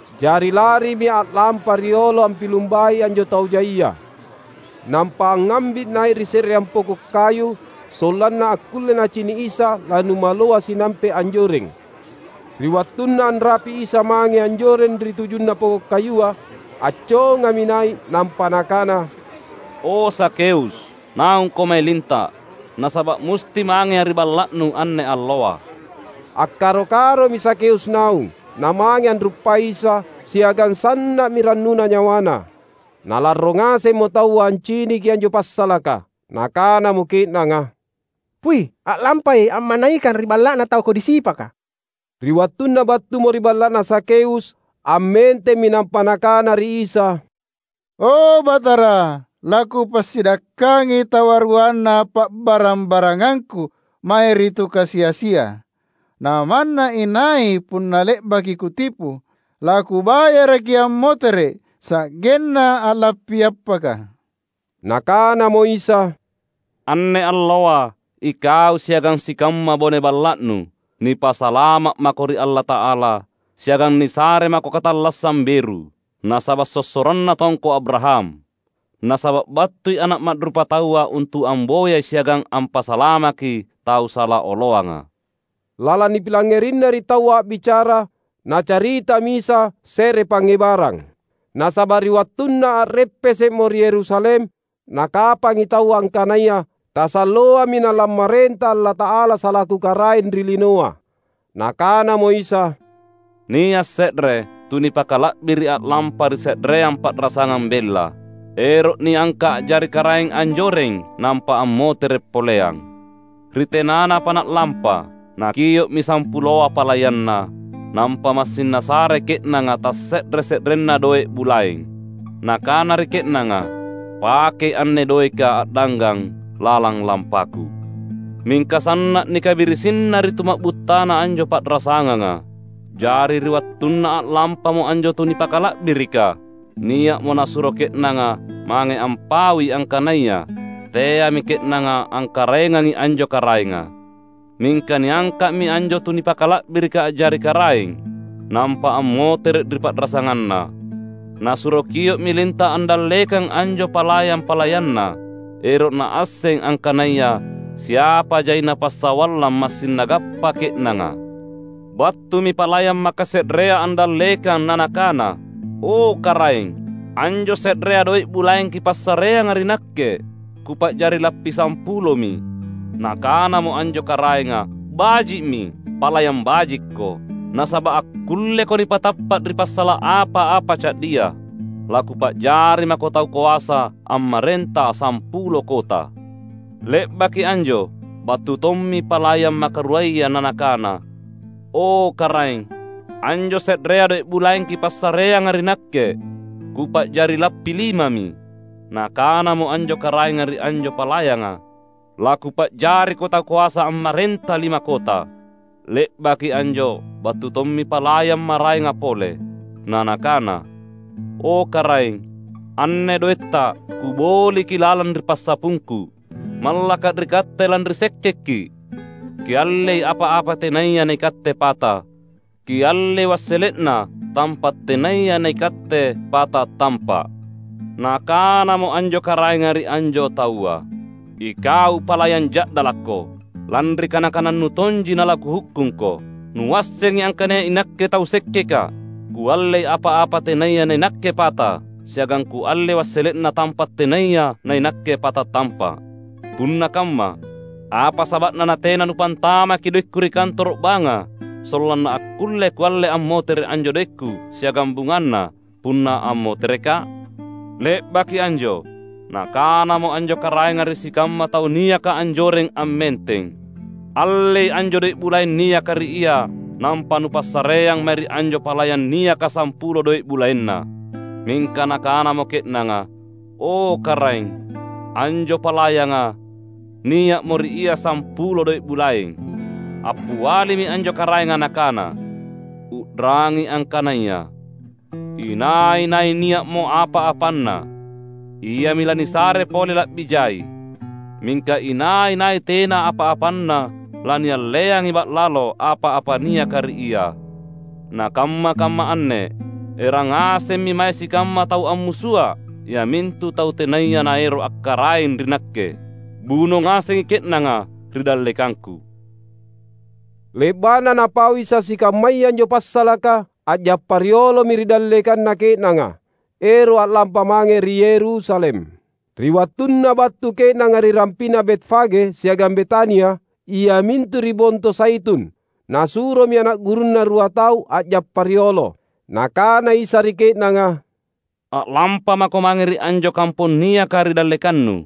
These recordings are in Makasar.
Jari larimi a’lampa riolo ampilumbai anjo tau jaia. Nampa angngambi’ nai’ ri se’reang poko’ kayu, sollanna akkulle nacini’ Isa lanumaloa sinampe’ anjoreng. Ri wattunna anrapi’ Isa mange anjoreng ri tujunna poko’ kayua, accongami nai’. Nampa Nakana, "O Zakheus, naungko mae linta’! Nasaba’ musti mangeA’ ri balla’nu anne alloa." Akkaro-karomi Zakheus naung, namange anruppai Isa, siagang sanna’mi rannuna nyawana. Nalarro ngasemmo taua anciniki anjo passalaka. Nakanamo ke’nanga, "Pui’! A’lampai a’manaikang ri balla’na tau kodi sipaka!" Ri wattunna battumo ri balla’na Zakheus, ammentemmi nampa nakana ri Isa, "O Batara, lakupassidakkangi tawaruanna pa’barang-barangangku mae ri tu kasi-asia; namanna inai punna le’baki kutipu, lakubayaraki ammotere’ sa’genna a’lappi appaka!" Nakanamo Isa, "Anne alloa ikau siagang sikamma bone balla’nu, nipasalama’ mako ri Allata’ala siagang nisare mako katallassang beru, nasaba’ sossoranna tongko Abraham. Nasaba’ battui Ana’ Ma’rupataua untu’ amboyai siagang ampasalamaki tau sala oloanga." Lalang nipilangngerina ri taua a’bicara, Nacaritami Isa se’re pangngebarang. Nasaba’ ri wattunna a’reppese’mo ri Yerusalem nakapangi taua angkanaya tasalloami nalammarenta Allata’ala salaku Karaeng ri linoa. Nakanamo Isa, "Nia’ se’re tu nipakala’biri’ a’lampa ri se’reang pa’rasangang bella, ero’ niangka’ a’jari karaeng anjoreng nampa ammotere’ poleang. Ri tenanapa na’lampa, nakio’mi sampuloa palayanna, nampa massing nasare ke’nanga tasse’re-se’renna doe’ bulaeng. Nakana ri ke’nanga, ‘Pakei anne doeka a’danggang lalang lampaku.’ Mingka sanna’ nikabirisinna ri tuma’buttana anjo pa’rasanganga. Jari ri wattunna a’lampamo anjo tu nipakala’birika, nia’mo nasuro ke’nanga mange ampaui angkanaya teami ke’nanga angkaraengangi anjo karaenga. Mingka niangka’mi anjo tu nipakala’birika a’jari karaeng, nampa ammotere’ ri pa’rasanganna. Nasuro kio’mi linta’ andallekang anjo palayang-palayanna, ero’ naasseng angkanaya siapa jaina passawallang massing nagappa ke’nanga. Battumi palayang makase’rea andallekang na nakana, ‘O karaeng, anjo se’rea doe’ bulaeng kipassareanga ri nakke, kupa’jari lappi sampulomi.’ Nakanamo anjo karaenga, ‘Baji’mi! Palayang bajikko! Nasaba’ akkulleko nipatappa’ ri passala’ apa-apa ca’dia, lakupa’jari mako tau koasa ammarenta sampulo kota.’ Le’baki anjo battu tommi palayang makaruaya na nakana, ‘O, karaeng, anjo se’rea doe’ bulaeng kipassareanga ri nakke, kupa’jari lappi limami.’ Nakanamo anjo karaenga ri anjo palayanga, ‘Lakupa’jariko tau koasa ammarenta lima kota.’ Le’baki anjo battu tommi palayang maraenga pole, na nakana, ‘O, karaeng, anne doetta; kuboliki lalang ri passapungku. Mallaka’ ri katte lanri sekkekki’. Kiallei apa-apa tenaya naikatte pata, kiallei wassele’na tampa’ tenaya naikatte pata tampa’!’ Nakanamo anjo karaenga ri anjo taua, ‘Ikau palayang ja’dalakko! Lanri kana-kanannu tonji nalakuhukkungko. Nuassengi angkanaya inakke tau sekkekka’: kuallei apa-apa tenaya nainakke pata, siagang kuallei wassele’na tampa’ tenaya nainakke pata tampa’. Punna kamma, apa saba’na natena nupantamaki doekku ri kantoro’ banga sollanna akkulle kualle ammotere’ anjo doekku siagang bungana punna ammoterekka’?’ Le’baki anjo, nakanamo anjo karaenga ri sikamma tau niaka anjoreng ammenteng, ‘Allei anjo doe’ bulaeng niaka ri ia nampa nupassareang mae ri anjo palayang niaka sampulo doe’ bulaenna.’ Mingka nakanamo ke’nanga, ‘O, karaeng, anjo palayanga nia’mo ri ia sampulo doe’ bulaeng.’ Appialimi anjo karaenga nakana, ‘U’rangi angkanaya: inai-nai nia’mo apa-apanna, iami lanisare pole la’bi jai. Mingka inai-nai tena apa-apanna lanialleangi ba’lalo apa-apa niaka ri ia. Na kamma-kamma anne erang ngasemmi mae sikamma tau ammusua’, iamintu tau tenaya naero’ akkaraeng ri nakke. Buno ngasengi ke’nanga ri dallekangku!’" Le’ba’na Napau Isa sikammaya anjo passalaka, a’jappa riolomi ri dallekanna ke’nanga, ero’ a’lampa mange ri Yerusalem. Ri wattunna battu ke’nanga ri rampi’na Betfage siagang Betania, iamintu ri Bonto Zaitun, Nasuromi ana’ gurunNa rua tau a’jappa riolo. Nakana Isa ri ke’nanga, "A’lampamako mange ri anjo kampong niaka ri dallekannu.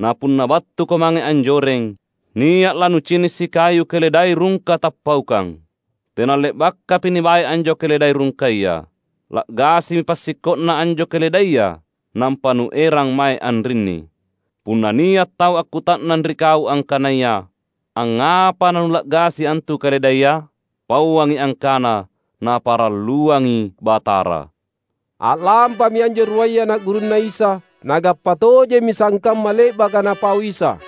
Na punna battuko mange anjoreng, nia’ lanucini’ sikayu keledai rungka tappaukang. Tena le’bakapi nibae anjo keledai rungkaya. La’gasimi passikko’na anjo keledaia, nampa nuerang mae anrinni. Punna nia’ tau akkuta’nang ri kau angkanaya, ‘Angngapa nanula’gasi antu keledaia?’ pauangi angkana, ‘Naparalluangi Batara.’" A’lampami anjo ruaya ana’ gurunNa Isa. Nagappa tojemmi sangkamma le’baka Napau Isa.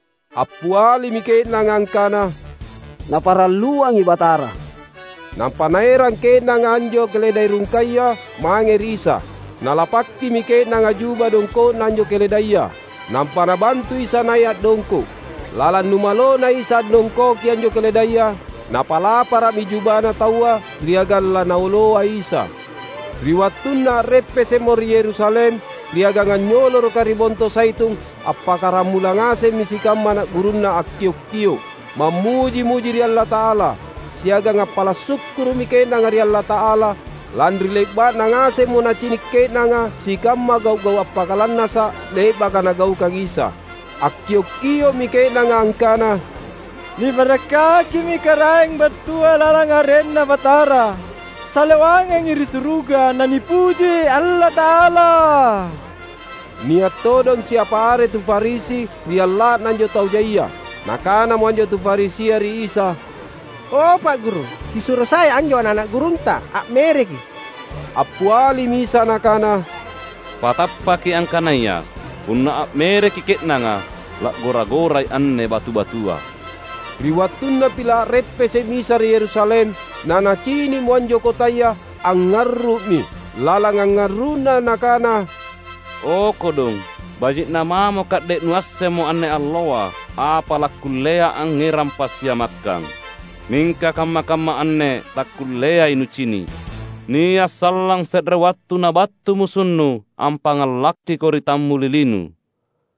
Appialimi ke’nanga angkana, "Naparalluangi Batara." Nampa naerang ke’nanga anjo keledai rungkaya mange ri Isa. Nalapakkimi ke’nanga juba dongko’na anjo keledaia, nampa nabantu Isa nai’ a’dongko’. Lalang numalona Isa andongkoki anjo keledaia, napalapara’mi jubana taua ri agang laNaoloa Isa. Ri wattunna a’reppese’mo ri Yerusalem, ri agang anynyoloroka ri Bonto Zaitun, appakkaramula ngasemmi sikamma ana’ gurunNa akkiok-kio’ mammuji-muji ri Allata’ala. Siagang appala’ sukkuru’mi ke’nanga ri Allata’ala, lanri le’ba’na ngasemmo nacini’ ke’nanga sikamma gau’-gau’ appakalannasa’ le’baka Nagaukang Isa. Akkiok-kio’mi ke’nanga angkana, "Nibarakkakimi Karaeng battua lalang arenNa Batara! Salewangangi ri suruga, nanipuji Allata’ala!" Nia’ todong siapa are tu Farisi ri alla’na anjo tau jaia. Nakanamo anjo tu Farisia ri Isa, "O, Pa’ Guru, Kisuro sai anjo ana’-ana’ gurunTa a’mereki’." Appialimi Isa Nakana, "Patappaki angkanaya: punna a’mereki ke’nanga, la’gora-gorai anne batu-batua." Ri wattunna pila’ a’reppese’ Isa ri Yerusalem, naNacini’mo anjo kotaya, angngarru’mi. Lalang angngarru’Na Nakana, "O kodong, baji’na mamo ka’de’ nuassemmo anne alloa apa lakkullea angngerang passiamakkang! Mingka kamma-kamma anne takkulleai nucini’. Nia’ sallang se’re wattu nabattu musunnu ampangngalakkiko ri tammulilinu;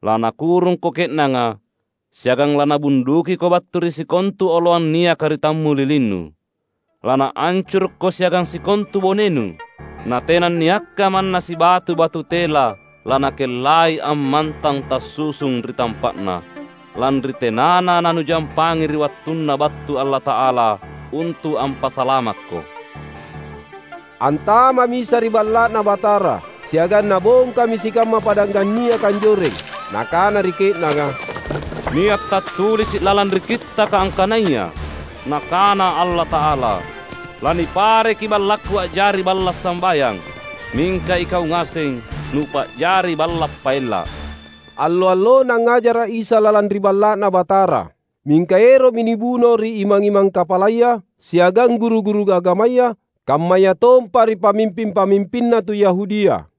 lanakurungko ke’nanga, siagang lanabundukiko battu ri sikontu oloang niaka ri tammulilinu. Lanaancurukko siagang sikontu bonenu; na tenanniakka manna sibatu batu tela lanakellai ammantang tassusung ri tampa’na, lanri tenana nanujampangi ri wattunna battu Allata’ala untu’ ampasalamakko!" Antama’mi Isa ri Balla’Na Batara, siagang Nabongkami sikamma padanggang niaka anjoreng. Nakana ri ke’nanga, "Nia’ tattulisi’ lalang ri Kittaka angkanaya: Nakana Allata’ala ‘Lanipareki BallakKu a’jari Balla’ Sambayang.’ Mingka ikau ngaseng, nupa’jari balla’ paella’!" Allo-allona angngajara’ Isa lalang ri Balla’Na Batara. Mingka ero’mi nibuno ri imang-imang kapalaya, siagang guru-guru agamaya, kammayatompa ri pamimping-pamimpinna tu Yahudia.